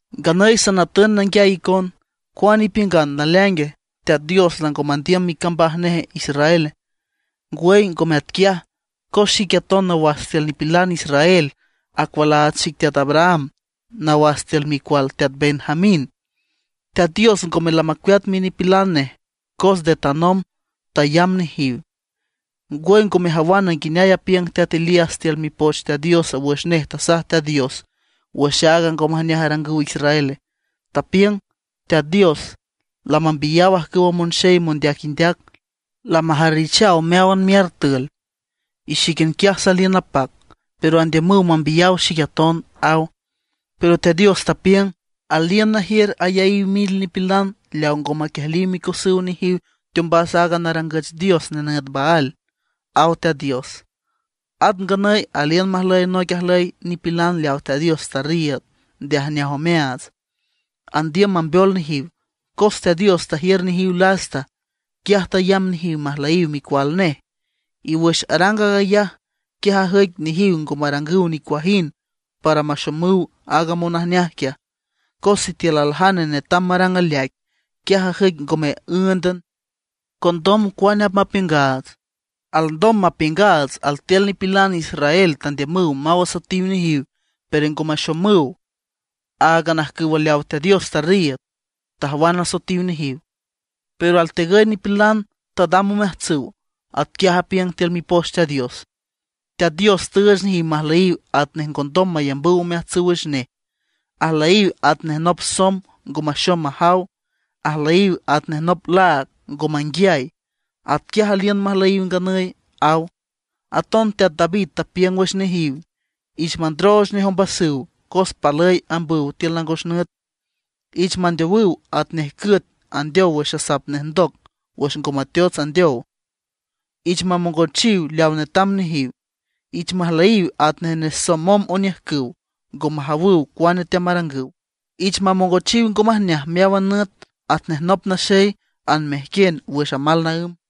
Nganüy sanatün nanguiay icon: ¿Cuane ipiüngan, naleaingue, Teat Dios lango mandiüm micambaj neje Israel? ¡Ngwüy ngome atquiaj! Cos xique aton nawas tiül nipilan israel, acualaats xic teat Abraham, nawas tiül micual teat Benjamín. Teat Dios ngome lamacueat minipilan nej, cos nde tanomb tayamb nejiw. ¿Ngwüy ngo mejawan nguineay apiüng teat Elías tiül Mipoch Teat Dios wüx nej tasaj Teat Dios wüx aaga ngo majneaj arangüw Israele? Tapiüng: “Teat Dios, lamambiyaw ajcüwa monxey mondeac indeac, lamajarrijchaw meáwan miartül, y xíquian quiaj saliün napac, pero andiümüw mambiyaw xic aton”, aw. Pero Teat Dios tapiüng: “Aliün najiür ayaíw mil nipilan leaw ngo maquiejliw micosüw nejiw teombas aaga narangüch dios nenüt Baal”, aw Teat Dios. At nganüy aliün majlüy noic ajlüy nipilan leaw Teat Dios tarriiüd nde ajneaj omeaats, andiüm mambeol nejiw. Cos Teat Dios tajiür nejiw lasta, quiaj tayamb nejiw majlüyiw micual nej; y wüx arang aag ayaj, quiaj ajüic nejiw ngo marangüw nicuajind para maxomüw aaga monajneaj quiaj. Cos sitiül aljane netam marang aleaic, quiaj ajüic ngome ǘündan. ¿Condom cuane apmapiüngaats? Alndom mapiüngaats altiül nipilan israel tandiümüw maw asoetiw nejiw, pero ngo maxomüw; áagan ajcüwa leaw Teat Dios tarriiüd, tajwan asoetiw nejiw; pero altegüy nipilan tadam omeajtsüw. Atquiaj apiüng tiül Mipoch Teat Dios: “Teat Dios tüüch nejiw majlüyiw atnej ngondom mayambüw omeajtsüw wüx nej; ajlüyiw atnej nop somb ngo maxom majaw; ajlüyiw atnej nop laag ngo manguiay. Atquiaj aliün majlüyiw nganüy”, aw. Aton teat David tapiüng wüx nejiw: Ich mandrooch nej ombasüw, cos palüy ambüw tiül nangos nüt. Ich mandeowüw atnej cüet andeow wüx asap nej ndoc wüx ngo mateots andeow. Ich mamongochiw leaw netam nejiw. Ich majlüyiw atnej nesomom oniüjcüw, ngo majawüw cuane teamarangüw. Ich mamongochiw ngo majneaj meáwan nüt atnej nop naxey anmejquien wüx amal naǘm.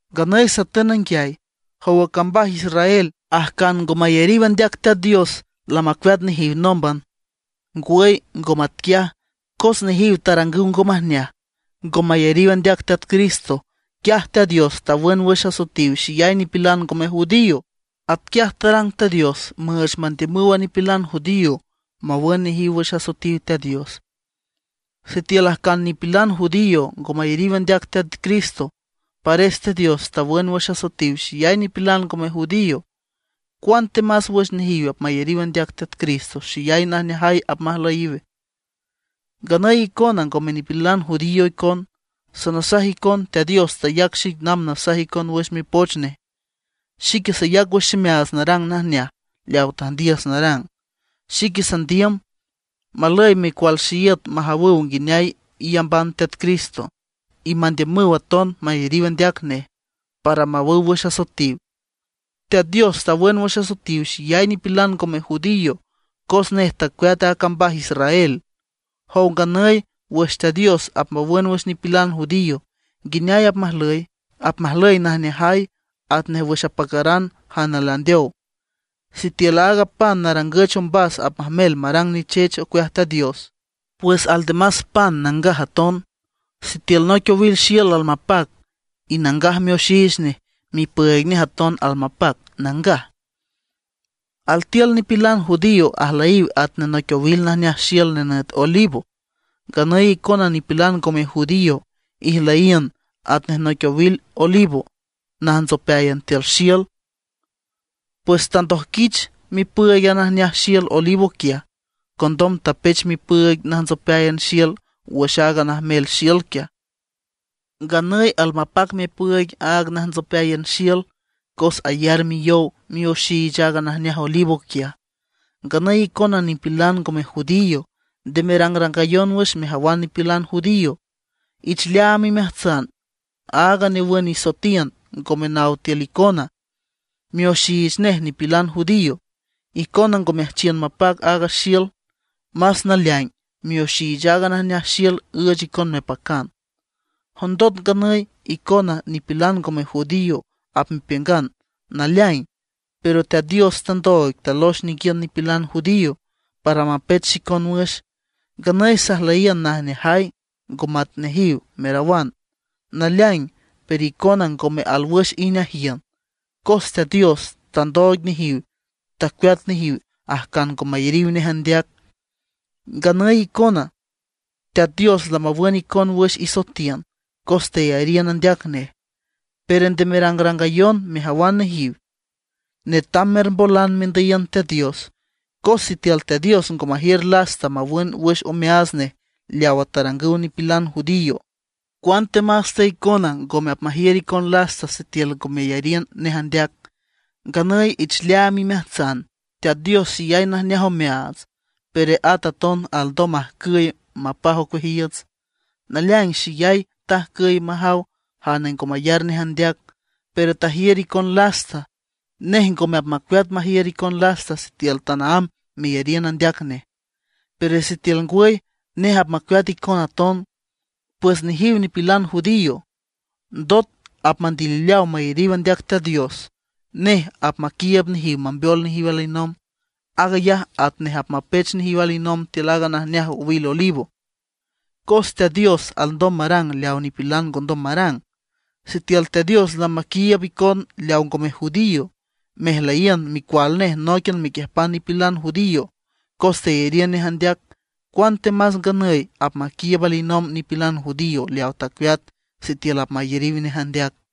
Nganüy satün nanguiay: ¿Jowa cambaj Israel, ajcan ngo mayariw andeac Teat Dios, lamacueat nejiw nómban? ¡Ngwüy ngo matquiaj! Cos nejiw tarangüw ngo majneaj, ngo mayariw andeac Teat Cristo, quiaj Teat Dios tawün wüx asoetiw xeyay nipilan ngome judío. Atquiaj tarang Teat Dios müüch mandiümüw a nipilan judío mawün nejiw wüx asoetiw Teat Dios. Sitiül ajcan nipilan judío ngo mayariw andeac Teat Cristo, pares Teat Dios tawün wüx asoetiw xeyay nipilan ngome judío, ¡cuantemas wüx nejiw apmayariw andeac Teat Cristo xeyay najneajay apmajlüyiw! Nganüy icona ngome nipilan judío icon, sanasaj icon Teat Dios tayac xic namb nasaj icon wüx Mipoch Nej, xique sayac wüx ximeaats narang najneaj leaw tüjndiüs narang. Xique sandiüm, malüy micual xeíüt majawüw nguineay iyamban Teat Cristo, y mandiümüw aton mayariw andeac nej, para mawüw wüx asoetiw. Teat Dios tawün wüx asoetiw xeyay nipilan ngome judío, cos nej tacueat a cambaj Israel. Jow nganüy wüx Teat Dios apmawün wüx nipilan judío, ¿nguineay apmajlüy? Apmajlüy najneajay, atnej wüx apacaran jane landeow. Sitiül aaga pan narangüch ombas apmajmel marang nichech ocueaj Teat Dios, pues aldemas pan nangaj aton. Sitiül noic owil xiül almapac y nangaj mioxiich nej, mipüüig nej aton almapac, nangaj. Altiül nipilan judío ajlüyiw atnej noic owil najneaj xiül nenüt olivo; nganüy icona nipilan ngome judío ijlüyiün atnej noic owil olivo najntsopeáyan tiül xiül. Pues tandojquiüt mipüüig a najneaj xiül olivo quiaj, condom tapech mipüüig najntsopeáyan xiül wüx aaga najneaj xiül quiaj. Nganüy almapac mipüüig aaga najntsopeáyan xiül cos ayar miyow mioxiich aaga najneaj olivo quiaj. Nganüy icona nipilan ngome judío, nde merangrangayon wüx mejawan nipilan judío. Ich leaam imeajtsan aaga newün isoetiün ngome naw tiül icona; mioxiich nej nipilan judío. Icona ngo meajchiün mapac aaga xiül; más naleaing mioxiich aaga najneaj xiül üüch icon mepacan. Jondot nganüy icona nipilan ngome judío apmepiüngan: “Naleaing, pero Teat Dios tandooig talox ninguiün nipilan judío para mapech xicon wüx; nganüy sajlüyiün najneajay ngo mat nejiw”, merawan. Naleaing, pero icona ngome alwüx ijneajiün, cos Teat Dios tandooig nejiw, tacueat nejiw ajcan ngo mayariw andeac. Nganüy icona, Teat Dios lamawün icon wüx isoetiün cos teyariün andeac nej. Pero nde merangrangayon mejawan nejiw, netam mermbolan mendüyiün Teat Dios. Cos sitiül Teat Dios ngo majiür lasta mawün wüx omeaats nej leawa tarangüw nipilan judío, cuantemas te icona ngome apmajiür icon lasta sitiül ngo meyariün nej andeac. Nganüy ich leaam imeajtsan Teat Dios xeyay najneaj omeaats, pero at aton alndom majcüy, mapaj ocueajiiüts. Naleaing xeyay tajcüy majaw jane ngo mayar nej andeac, pero tajiür icon lasta. Nej ngome apmacueat majiür icon lasta sitiül tanaámb meyariün andeac nej, pero sitiül ngwüy, nej apmacueat icon aton. Pues nejiw nipilan judío, ndot apmandilileaw mayariw andeac Teat Dios, nej apmaquiiüb nejiw mambeol nejiw alinomb. Aag ayaj atnej apmapech nejiw alinomb tiül aaga najneaj owil olivo. Cos Teat Dios alndom marang leaw nipilan ngondom marang. Sitiül Teat Dios lamaquiiüb icon leaw ngome judío, mejlüyiün micual nej nóiquian mequiüjpan nipilan judío cos teyariün nej andeac; cuantemas nganüy apmaquiiüb alinomb nipilan judío leawa tacueat, sitiül apmayariw nej andeac.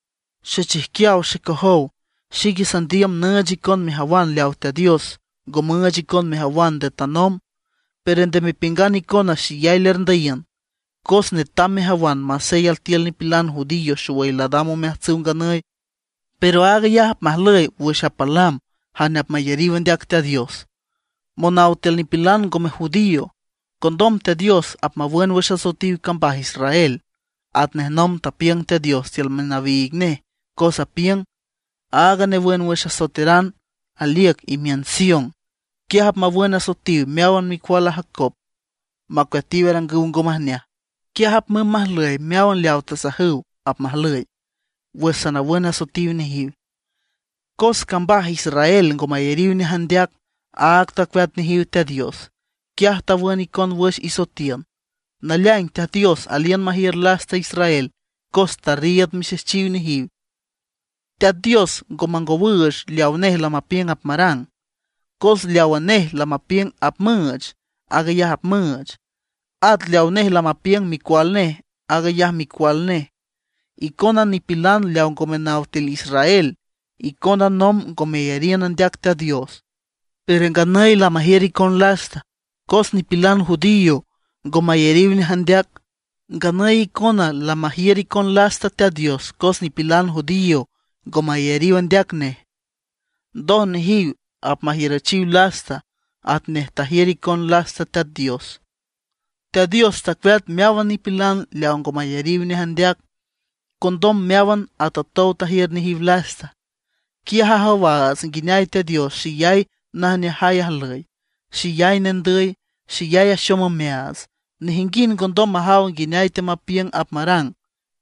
Xechijquiaw xecojow, xique sandiüm nüüch icon mejawan leaw Teat Dios ngo müüch icon mejawan nde tanomb; pero nde mepiüngan icona xeyay lerndüyiün. Cos netam mejawan masey altiül nipilan judío xowüy ladam omeajtsüw nganüy; pero aag ayaj apmajlüy leaw apalam jane apmayariw andeac Teat Dios monaw tiül nipilan ngome judío. Condom Teat Dios apmawün wüx asoetiw cambaj Israel, atnej nomb tapiüng Teat Dios tiül minawiig nej, cos apiüng: Aaga newün wüx asoeteran aliüc imiün Sion, quiaj apmawün asoetiw meáwan micual a Jacob, macueatiw arangüw ngo majneaj. Quiaj apmümb majlüy meáwan leaw tasajasüw apmajlüy, wüx sanawün asoetiw nejiw. Cos cambaj Israel ngo mayariw nej andeac, áag tacueat nejiw Teat Dios, quiaj tawün icon wüx isoetiün. Naleaing Teat Dios aliün majiür lasta Israel cos tarriiüd mixejchiw nejiw. Teat Dios ngo mangowüüch leaw nej lamapiüng apmarang, cos leawa nej lamapiüng apmüüch, aag ayaj apmüüch. At leaw nej lamapiüng micual nej, aag ayaj micual nej. Icona nipilan leaw ngome naw tiül Israel, icona nomb ngo meyariün andeac Teat Dios, pero nganüy lamajiür icon lasta, cos nipilan judío ngo mayariw nej andeac. Nganüy icona lamajiür icon lasta Teat Dios cos nipilan judío ngo mayariw andeac nej. Ndoj nejiw apmajiürüchiw lasta atnej tajiür icon lasta Teat Dios. Teat Dios tacueat meáwan nipilan leaw ngo mayariw nej andeac. Condom meáwan atotow tajiür nejiw lasta. Quiaj ajawaats nguineay Teat Dios xeyay najneajay ajlüy, xeyay nendüy, xeyay axom omeaats. Nejinguind ngondom majaw nguineay teamapiüng apmarang,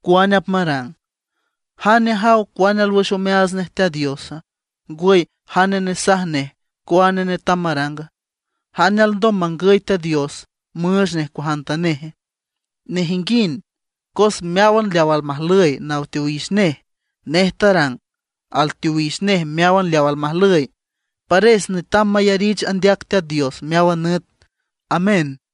cuane apmarang. “¿Jane ajaw cuane alwüx omeaats nej Teat Diosa, ngwüy jane nesaj nej cuane netam maranga? ¿Jane alndom mangüy Teat Dios, müüch nej cuajantaneje?” Nejinguind, cos meáwan leaw almajlüy naw teowix nej, nej tarang; alteowix nej meáwan leaw almajlüy. Pares netam mayarich andeac Teat Dios meáwan nüt. ¡Amén!